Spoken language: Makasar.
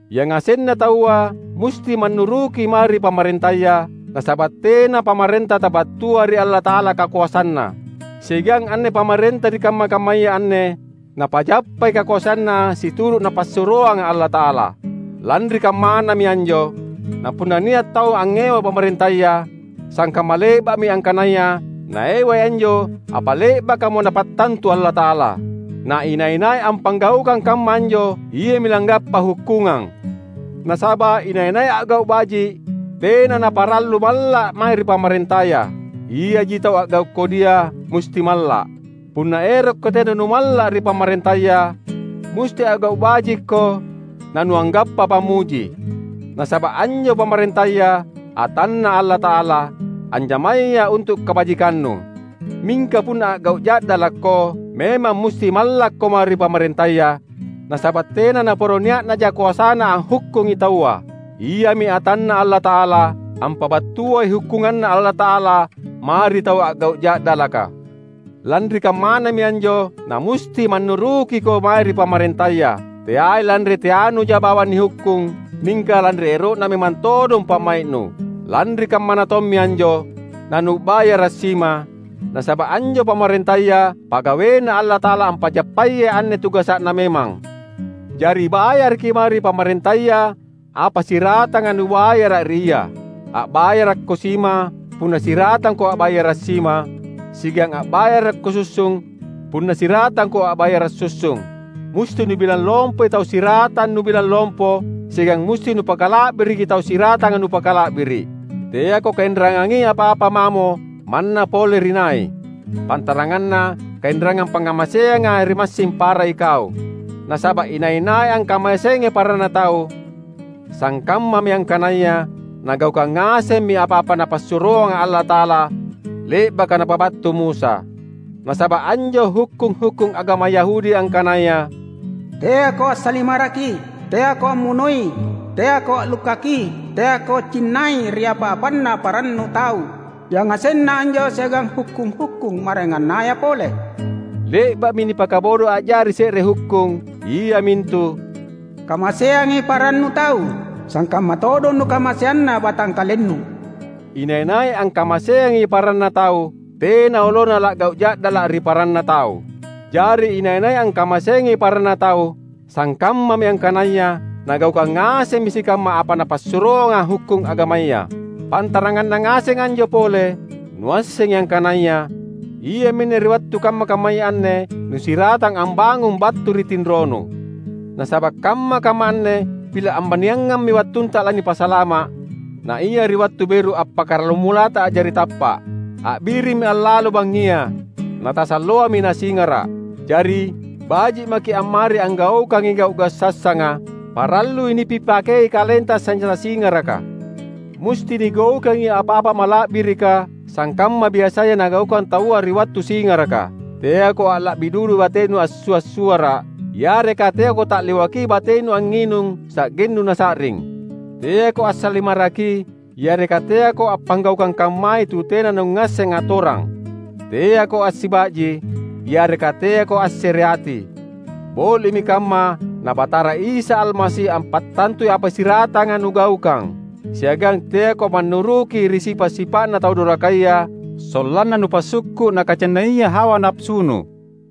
Yangasenna taua musti mannuruki mae ri pamarentaya; nasaba’ tena pamarenta tabattua ri Allata’ala kakoasanna. Siagang anne pamarenta ri kamma-kammaya anne, napajappai kakoasanna situru’ Napassuroanga Allata’ala. Lanri kammanami anjo, napunna nia’ tau angngewai pamarentaya, sangkamma le’ba’mi angkanaya naewai anjo apa le’bakamo Napattantu Allata’ala. Na inai-nai appanggaukang kamma anjo iami langgappa hukkungang. Nasaba’ inai-nai a’gau’ baji’ tena naparallu malla’ mae ri pamarentaya. Iaji tau a’gau’ kodia musti malla’. Punna erokko tena numalla’ ri pamarentaya, musti a’gau’ bajikko, nanuanggappa pammuji. Nasaba’ anjo pamarentaya atanNa Allata’ala, anjamaya untu’ kabajikannu. Mingka punna a’gau’ ja’dalakko, memang musti mallakko mae ri pamarentaya; nasaba’ tena naporo nia’naja koasana anghukkungi taua. Iami atanNa Allata’ala, ampabattuai hukkunganNa Allata’ala mae ri tau a’gau’ ja’dalaka. Lanri kammanami anjo namusti mannurukiko mae ri pamarentaya — teai lanri teanuja bawang nihukkung, mingka lanri ero’na memang todong pa’mai’nu. Lanri kammana tommi anjo nanua’bayara’ sima; nasaba’ anjo pamarentaya pagaweNa Allata’ala ampajappayai anne tugasa’na memang. Jari bayaraki mae ri pamarentaya apa siratanga nubayara’ ri ia. A’bayarakko sima punna siratangko a’bayara’ sima; siagang a’bayarakko sussung punna siratangko a’bayara’ sussung. Musti nubilang lompoi tau siratang nubilang lompo siagang musti nupakala’biriki tau siratanga nupakala’biri’. Teako kainrangangi apa-apa mamo manna pole ri nai, pantaranganna kainrangang pangngamaseanga ri massing para ikau. Nasaba’ inai-nai angkamaseangi paranna tau, sangkammami angkanaya nagaukang ngasemmi apa-apa Napassuroanga Allata’ala le’baka napabattu Musa. Nasaba’ anjo hukkung-hukkung agama Yahudi angkanaya: Teako assalimaraki; teako ammunoi; teako a’lukkaki; teako cinnai ri apa-apanna parannu tau; yangasenna anjo siagang hukkung-hukkung maraengannaya pole, le’ba’mi nipakabodo a’jari se’re hukkung, iamintu, "Kamaseangi parannu tau, sangkamma todong nukamaseanna batangkalennu." Inai-nai angkamaseangi paranna tau, tena olona la’gau’ ja’dala’ ri paranna tau. Jari inai-nai angkamaseangi paranna tau, sangkammami angkanaya nagaukang ngasemmi sikamma apa napassuroanga hukkung agamaya. Pantaranganna ngaseng anjo pole, nuassengi angkanaya iaminne ri wattu kamma-kammaya anne nusiratang ambangung battu ri tinronu. Nasaba’ kamma-kamma anne pila’ ambaniangammi wattunta lanipasalama’, naia ri wattu beru appakkaramulata a’jari tappa’. A’birimmi allalo bangngia; natasalloami nasingara’. Jari, baji’ maki’ ammari anggaukangi gau’-gau’ sassanga. Parallui nipipakei kalenta sanjata singaraka. Musti nigaukangi apa-apa mala’birika, sangkamma biasaya nagaukang taua ri wattu singaraka; teako alla’bi dudu batenu assua’-suara’, yareka teako ta’liwakki batenu angnginung sa’gennu nasa’ring. Teako assalimaraki, yareka teako appanggaukang kammai tu tena nungngasseng atorang. Teako assiba’ji, yareka teako assereati. Boli’mi kamma na Batara Isa Almasi ampattantui apa siratanga nugaukang. Siagang teako mannuruki ri sipa’-sipa’na tau dorakaya sollanna nupasukku’ nakacinnaia hawa napasunu.